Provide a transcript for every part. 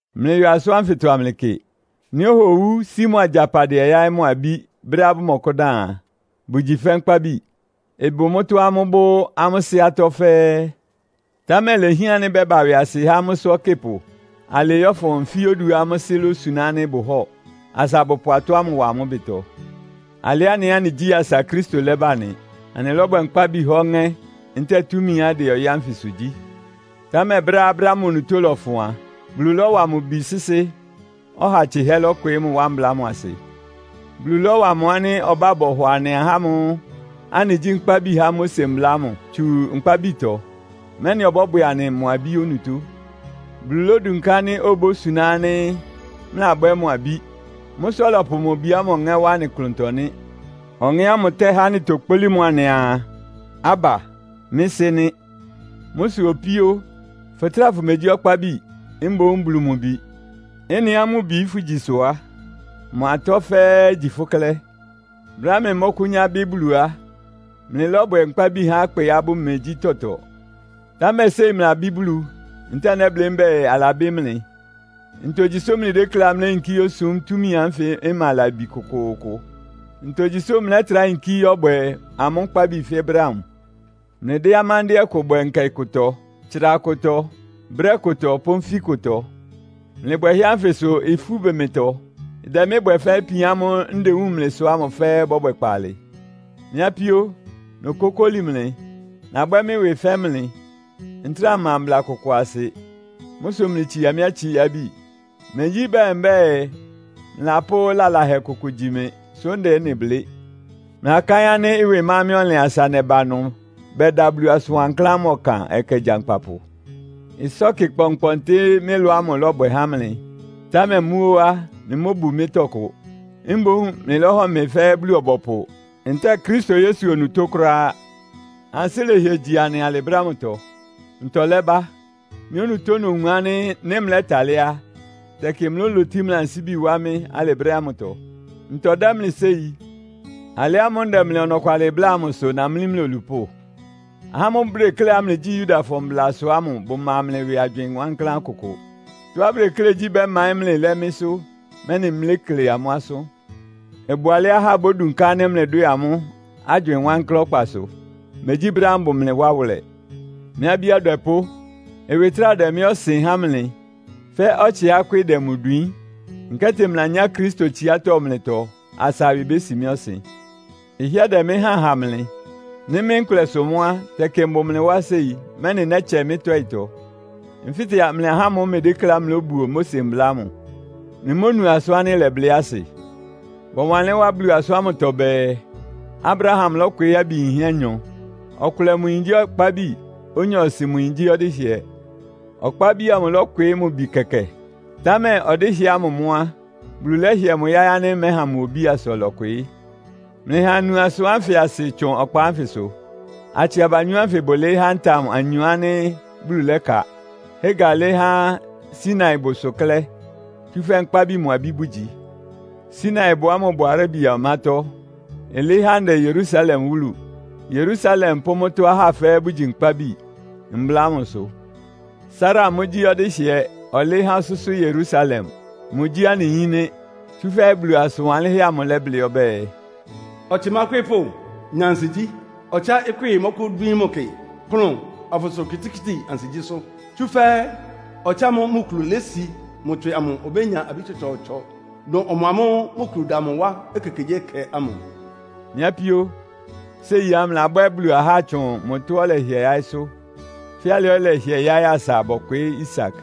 Mlɩyɔ asʋ́n ánfɩtɔ kɩ. Nɩ́ ɔha owú, sí mʋ agyapadɩɛ yáɩ́ mʋ abí brɛ́á bʋmɔkʋ́dan a, bʋgyi fɛ́ nkpábi. Ɩbʋ mʋ́tɔ́á amʋ́bʋ́ amʋ́ sɩ́ atɔ́ fɛ́ɛ́, támɛ ilehián ánɩ́ bɛ́ba ɩwɩasɩ há amʋ́sʋ́ ɔkɩ́pʋ alɩɩ yɔ́fʋn nfí oduá amʋ́ sɩ́ lósuná ánɩ́ bʋhɔ́ɔ, asa abʋpʋ atɔ́ ámʋ wa amʋ́ ɩbɩtɔ. Alɩ anɩ ɛ́ anɩgyí asa Kristo lɛ́ba nɩ. Anɩlɔ́bwɛ nkpábi há ɔŋɛ́, ntɛ́ɛ túmiá ɩdɛ ɔyɩ́ ánfɩsʋ gyí. Támɛ brɛ́á brɛ́ ámʋ onutó lɔfʋn a, Bulu lɔ́wa mʋ Bi sɩ́sɩ́, ɔha tsɩhɛ́ lɔ́kwɩɩ́ mʋ wá mbla ámʋ asɩ. Bulu lɔ́wa mʋ ánɩ́ ɔbá bɔhɔ anɩ ahá ámʋ́ʋ́ anɩgyí nkpábi há Mose mbla ámʋ tsu nkpábitɔ, mɛ́nɩ ɔbɔ́bwɛ anɩ mʋ abí onutó. Bulu lódunká ánɩ́ obósuná ánɩ́ mlɩlabwɛ́ mʋ abí. Mʋ́ sʋ́ ɔlɔpʋ mʋ Bi ámʋ Ɔŋɛ́ wá anɩ ɩklʋntɔ nɩ́. Ɔŋɛ́ ámʋ tɛ́há anɩtokpólí mʋ anɩaa, “Abba, mɩ́ Sɩ́!” nɩ́. Mʋ́ sʋ opíó, fʋtráa fʋmegyí ɔkpábi, mboún Bulu mʋ bi. Ɩ́nɩá mʋ bi fʋgyi sʋ á, mʋ atɔ́ fɛ́ɛ́ igyi fʋ́ klɛ́. Brɛ́á mlɩmɔ́kʋ́nyá bɩ́ Bulu á, mlɩlɔ́bwɛ nkpábi há ɩkpɩá bʋmegyí tɔtɔ. Támɛ séi mlɩlabɩ́ Bulu, ntɛ́ɛ nɛ́blɩ́ mbɛ́ɛ, alabɩ́ mlɩ. Ntogyi sʋ́ mlɩdékléá mléyinkí yósum túmi ánfɩ ɩma labi kʋkʋʋkʋ? Ntogyi sʋ́ mlɛ́trá yinkí yɔ́bwɛ amʋ́ nkpábi fɛ́ brɛ́ ámʋ? Mlɩdɛ́ amándɩ́ɛ́ kʋ bwɛ nkɛ kʋtɔ, tsra kʋtɔ, brɛ́ kʋtɔ pʋ́ nfí kʋtɔ. Mlɩ bwɛhɛ́ ánfɩ sʋ ifú bʋ mɩtɔ. Ɩdɛ mɩ́ bwɛ fɛ́ ipian ámʋ́ʋ́ ndewúun mlɩ sʋ ámʋ fɛ́ɛ́ ɩbɔ́bwɛ kpaalɩ. Mɩ́ apíó, nokókóli mlɩ, nabwɛ́ mɩ́ ɩwɩ fɛ́ mlɩ. Ntráa mma mbla kʋkʋ asɩ. Mʋ́ sʋ mlɩtsia mɩ́ atsiábi. Megyí bɛɛ mbɛ́ɛ, mlɩlapʋ́ lalahɛ kʋkʋ gyi mɩ, sʋ́ ndɛ ɩ́nɩ blɩ́. Mlɩlakáɩ́n ánɩ́ ɩwɩ ma mɩ́ ɔnlɩn asa nɛba ɩnʋ bɛda Bulu asʋn wankláán ámʋ ɔkan ɛkɛ gyankpapʋ? Ɩsɔ́kɩ kpɔnkpɔntɩ mɩ́ ɩlɔ ámʋ lɔ́bwɛ há mlɩ, támɛ mʋ́ óó á, mlɩmóbu mɩ́ tɔkʋ. Mboún mlɩlɔ́hɔ mɩ fɛ́ Bulu-ɔbɔpʋ, ntɛ́ɛ Kristo Yesu onutó kʋ́ráá. Ansɩ́ lɛhɩɛ́ gyi anɩ alɩ brɛ́ ámʋtɔ! Ntɔ lɛ́bá? Mɩ́ onutó nowun ánɩ́ nɩ́ mlɛ́talɩ́ á, tɛkɩ mlɩlólotí mlɩ ansíbi wá mɩ́ alɩ brɛ́ ámʋtɔ. Mʋ́ ntɔ dɛ́ mlɩ séi? Alɩ ámʋ́ʋ́ ndɛ mlɩ ɔnɔkwalɩ bláa amʋ sʋ namlí mlɩ olupʋ́? Ahá ámʋ́ʋ́ bʋdekléá mlɩgyí Yudafɔ mblasʋ ámʋ bʋma mlɩ ɩwɩ agywɩɩn wankláán kʋkʋ. Tɔ́á bʋdeklé gyí bɛ́maɩ́n mlɩ lɛ́ mɩ́sʋ́, mɛ́nɩ mlékle amʋ́ asʋ́n. Ɩbʋ alɛ́á ahá bódunká ánɩ́ mlɩdwɛ́ɛ amʋ́, agywɩɩn wankláán ɔkpasʋ. Megyí brɛ́á mbʋ mlɩ wá wʋlɛ. Mɩ́ abí adwɛpʋ́! Ɩwɩ trá ɩdɛ mɩ́ ɔsɩn há mlɩ, fɛ́ ɔtsɩá ɩkwɩ́ɩ dɛ mʋ dwiín. Nkɛ́tɩ mlɩlanyá Kristo tsiátɔ́ mlɩtɔ asa ɩwɩ bési mɩ́ ɔsɩn. Ɩhɩ́ɛ́ dɛ mɩ́ háan ha mlɩ. Nɩ́ mɩ́ nkʋlɛ sʋ mʋ́ á, tɛkɩ mbʋ mlɩ wá séi, mɛ́nɩ nɛ́tsɛ mɩ́ tɔ́ɩtɔ. Nfɩ́tɛ mlɩ ahá ámʋ́ʋ́ mlɩdékléá mlóbuo Mose mbla ámʋ. Mlɩmónu asʋ́n ánɩ́ ɩlɛblɩ́ asɩ? Bɔwanlɩ́n wá Bulu asʋ́n ámʋtɔ bɛɛ, Abraham lɔ́kwɩɩ́ abi yinhɛ́ anyɔ. Ɔkʋlɛ mʋ yin gyí ɔkpábi, onyɔɔsɩ mʋ yin gyí ɔdɩ́hɩɛ. Ɔkpábi amʋ lɔ́kwɩɩ́ mʋ bi kɛkɛ, támɛ ɔdɩ́hɩɛ ámʋ mʋ́ á, Bulu lɛ́hɩɛ mʋ yáɩ́ ánɩ́ mɛ́ha mʋ obí asa ɔlɔkwɩɩ́. Mlɩha anu asʋ́n ánfɩ asɩ tsʋn ɔkpa ánfɩsʋ. Atsɩ abanyɔ́ ánfɩ bʋlɩɩ́ há ntam anyɔ ánɩ́ Bulu lɛ́ka. Hagar lɩ́ɩ́ há Sinaibʋsʋ klɛ́, tsúfɛ́ nkpábi mʋ abí bʋgyi. Sinaibʋ ámʋ bʋ Arabia ɔmátɔ́. Ɩlɩɩ́ há ndɛ Yerusalem wúlu. Yerusalem pʋ́ mʋ́tɔ́ ahá fɛ́ɛ́ bʋgyi nkpábi, Mbla ámʋ sʋ. Sara mʋ́ gyí ɔdɩ́hɩɛ, ɔlɩɩ́ há ɔsʋ́sʋ́ Yerusalem. Mʋgyí anɩ yín nɩ́. Tsúfɛ́ Bulu asʋ́n wanlɩ́nhɛ́ amʋ lɛ́blɩ́ ɔbɛ́ɛ, “Ɔtsɩ mákwɩ́ɩ́pʋ́, nya ansigyí! Ɔtsɩá ɩkwɩ́ɩ mɔkʋ́dwíín mʋ kɩ, kplʋn, afʋsʋra okitikíti ansigyísʋ́. Tsúfɛ́ ɔtsɩ ámʋ́ʋ́ mʋ kulu lési mʋ tswɩ amʋ obénya abí tsɔtsɔɔtsɔ, dʋn ɔmʋamʋ́ʋ́ mʋ kulu da mʋ wá ekekegyíɛkɛ ámʋ.” Mɩ́ apíó, séi á, mlɩlabwɛ́ Bulu ahá tsʋn mʋ tɔ́á ɔlɛhɩɛ yáɩ́sʋ́; fɛ́ alɩá ɔlɛhɩɛ yáɩ́ asa bɔkwɩɩ́ Isak.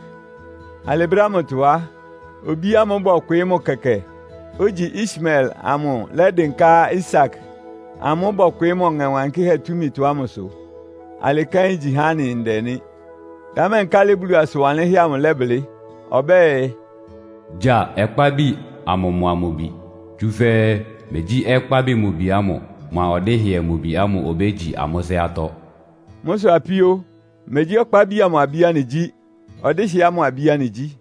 Alɩ brɛ́ ámʋtɔ á, obí ámʋ́ʋ́ bɔkwɩɩ́ mʋ kɛkɛ, ogyi Ismael amʋ lɛ́dɩnká Isak amʋ́ʋ́ bɔkwɩɩ́ mʋ Ɔŋɛ Wankɩ́hɛ́ túmitɔ ámʋsʋ. Alɩ kɛ́n igyi há anɩ ndɛ nɩ́. Támɛ nkálɩ Bulu asʋn wanlɩ́nhɛ́ amʋ lɛ́blɩ́? Ɔbɛ́ɛ, “Gya ɔkpábi amʋ mʋa mʋ bi, tsúfɛ́ megyí ɔkpábi mʋ bi ámʋ mʋa ɔdɩ́hɩɛ mʋ bi ámʋ obégyi amʋ́ sɩ́ atɔ́.” Mʋ́ sʋ apíó, megyí ɔkpábi amʋ abí anɩgyí. Ɔdɩ́hɩɛ ámʋ abí anɩgyí.